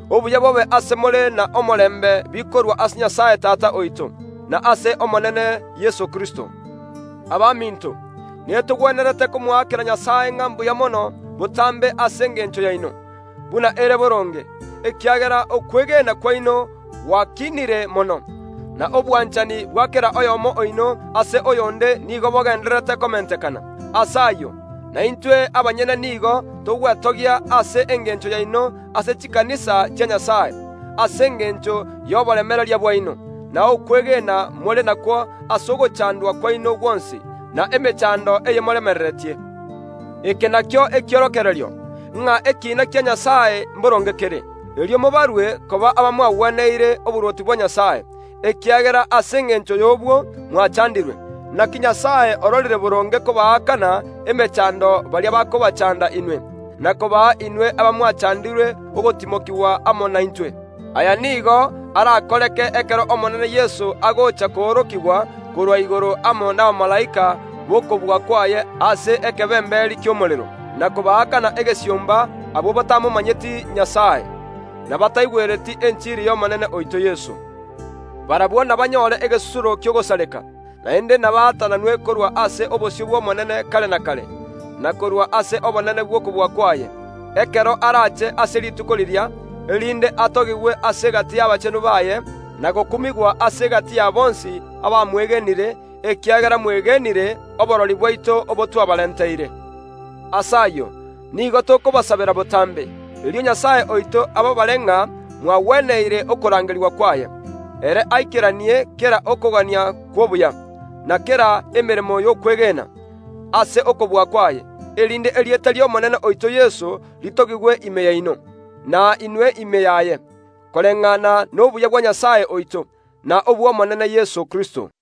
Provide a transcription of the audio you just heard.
Obuya bobe ase more na omorembe bikorwa ase Nyasae Tata oito, na ase Omonene Yeso Kristo. Abaminto, netogwenerete komoakera Nyasae ng’a mbuya mono botambe ase engencho yaino, buna ere boronge, ekiagera okwegena kwaino gwakiinire mono, na obwanchani bwa kera oyomo oino ase oyonde nigo bogendererete komentekana. Ase ayio, na intwe abanyene nigo togwetogia ase engencho yaino ase chikanisa chia Nyasae, ase engencho y’oboremereria bwaino, na okwegena more nakwo ase ogochandwa kwaino gwonsi, na emechando eye moremereretie. Eke nakio ekiorokererio, ng’a ekiina kia Nyasae mboronge kere. Erio mobarwe koba abamwagweneire oborwoti bwa Nyasae, ekiagera ase engencho y’obwo mwachandirwe. Naki Nyasae ororire boronge kobaakana emechando baria bakobachanda inwe, na kobaa inwe abamwachandirwe ogotimokigwa amo naintwe. Aya nigo arakoreke ekero Omonene Yeso agocha koorokigwa korwa igoro amo nabamalaika n’okobua kwaye ase ekebemberi ki’omorero, na kobaakana egesiomba abwo batamomanyeti Nyasae, na bataigwereti enchiri y’Omonene oito Yeso. Barabwo nabanyore egesusuro ki’ogosareka, naende nabaatananwe korwa ase obosio bw’Omonene kare na kare, na korwa ase obonene bw’okobua kwaye, ekero arache ase rituko riria, erinde atogigwe ase egati y’abachenu baye, na gokumigwa ase egati ya bonsi abamwegenire, ekiagera mwegenire oborori bwaito obo twabarenteire. Ase ayio, nigo tokobasabera botambe, erio Nyasae oito ababare ng’a mwagweneire okorangeria kwaye. Ere aikeranie kera okogania kw’obuya, na kera emeremo y’okwegena, ase okobua kwaye, erinde erieta ri’Omonene oito Yeso ritogigwe ime yaino, na inwe ime yaye, koreng’ana nobuya bwa Nyasae oito, na Omonene Yeso Kristo.